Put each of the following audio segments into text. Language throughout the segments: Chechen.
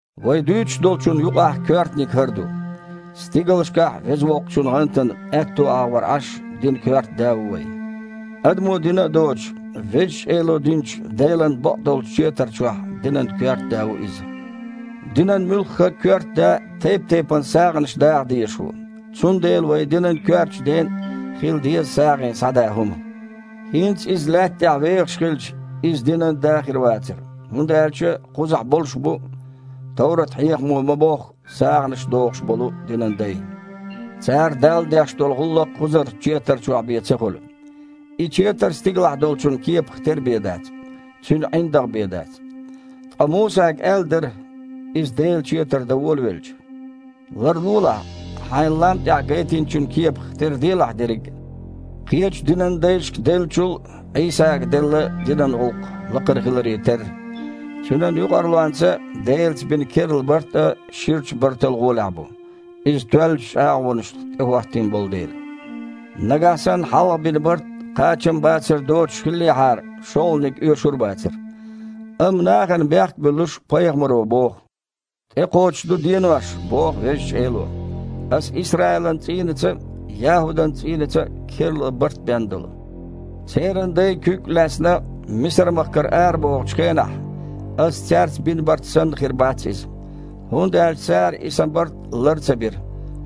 Вай дуьйцуш долчунна юкъахь коьртаниг хІара ду: стигалшкахь Веза Воккхачун гІантана аьтту агІор Іаш динан коьрта Да ву вайн. Адамо дина а доцуш, Везачу Эло динчу Делан бакъдолчу четар чохь динан коьрта Да ву Иза. Динан муьлхха а коьрта да тайп-тайпана сагІанаш даха дезаш ву, цундела вайн динан коьртачу Ден а хила деза сагІина схьадан хІума. ХІинца Иза лаьтта тІехь вехаш хилча, Иза динан да хир вацара, хІунда аьлча кхузахь болуш бу, товрат-хьехамо ма-бохху, сагІанаш дохуш болу динан дай. Цара Далла деш долу гІуллакх кхузарчу четар чохь бен ца хуьлу. И четар стигалахь долчун кепах тера бен дац, цуьнан ІиндагІ бен дац. Ткъа Мусага аьлла дара, иза Делан четар дан волавелча: «Ларлолахь, хьайна лам тІехь гайтинчун кепах тера делахь дерриг а». Кхечу динан дайшка деллачул а Іийсага делла динан гІуллакх лакхара хиларе терра, Цуьнан юкъарлонца Делаца бина керла барт а ширачу бартал гІолехь бу, иза тоьллачу чІагІонашна тІехІоттийна болу дела. Нагахь санна хьалха бина барт кхачамбацар доцуш хиллехьара, шолгІаниг оьшур а бацара. Амма, нахана бехк а буьллуш, пайхамаро боху: «ТІекхочуш ду денош, – боху Везачу Эло, – Аса Исраилан цІийнаца а, ЯхІудан цІийнаца а керла барт бен долу. Церан дай, куьг а лаьцна, Мисар-махкара арабохучу хенахь, Аса цаьрца бина барт санна хир бац иза. ХІунда аьлча цара и Сан барт лар ца бира,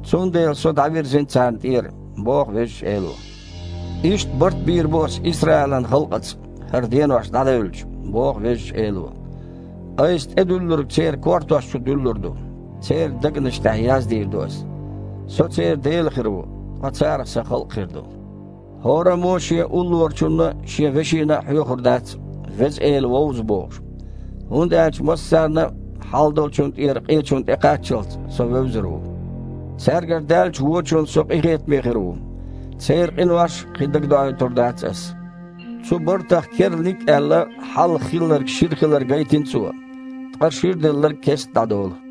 цундела со дІавирзина царна тІера, – боху Везачу Эло. Иштта барт бийр бу Аса Исраилан халкъаца, хІара денош дІадевлча, – боху Везачу Эло. – Айса тІедуьллург церан кортош чу дуьллур ду, церан дегнаш тІехь яздийр ду Аса. Со церан Дела хир ву, ткъа царах Сан халкъ хир ду. ХІораммо а шен уллорачунна а, шен вешина а хьоьхур дац: „Веза Эла вовза", – бохуш. ХІунда аьлча массарна а, хьалдолчунна тІера къечунна тІекхаччалц, Со вевзар ву. Цаьргара даьллачу вочунна Со къинхетаме хир ву, церан къинош кхин дагадоуьйтур дац Аса». Цу бартах «керланиг» а аьлла, хьалха хилларг шира хилар гайтина Цо, ткъа ширделларг кестта дІадолу.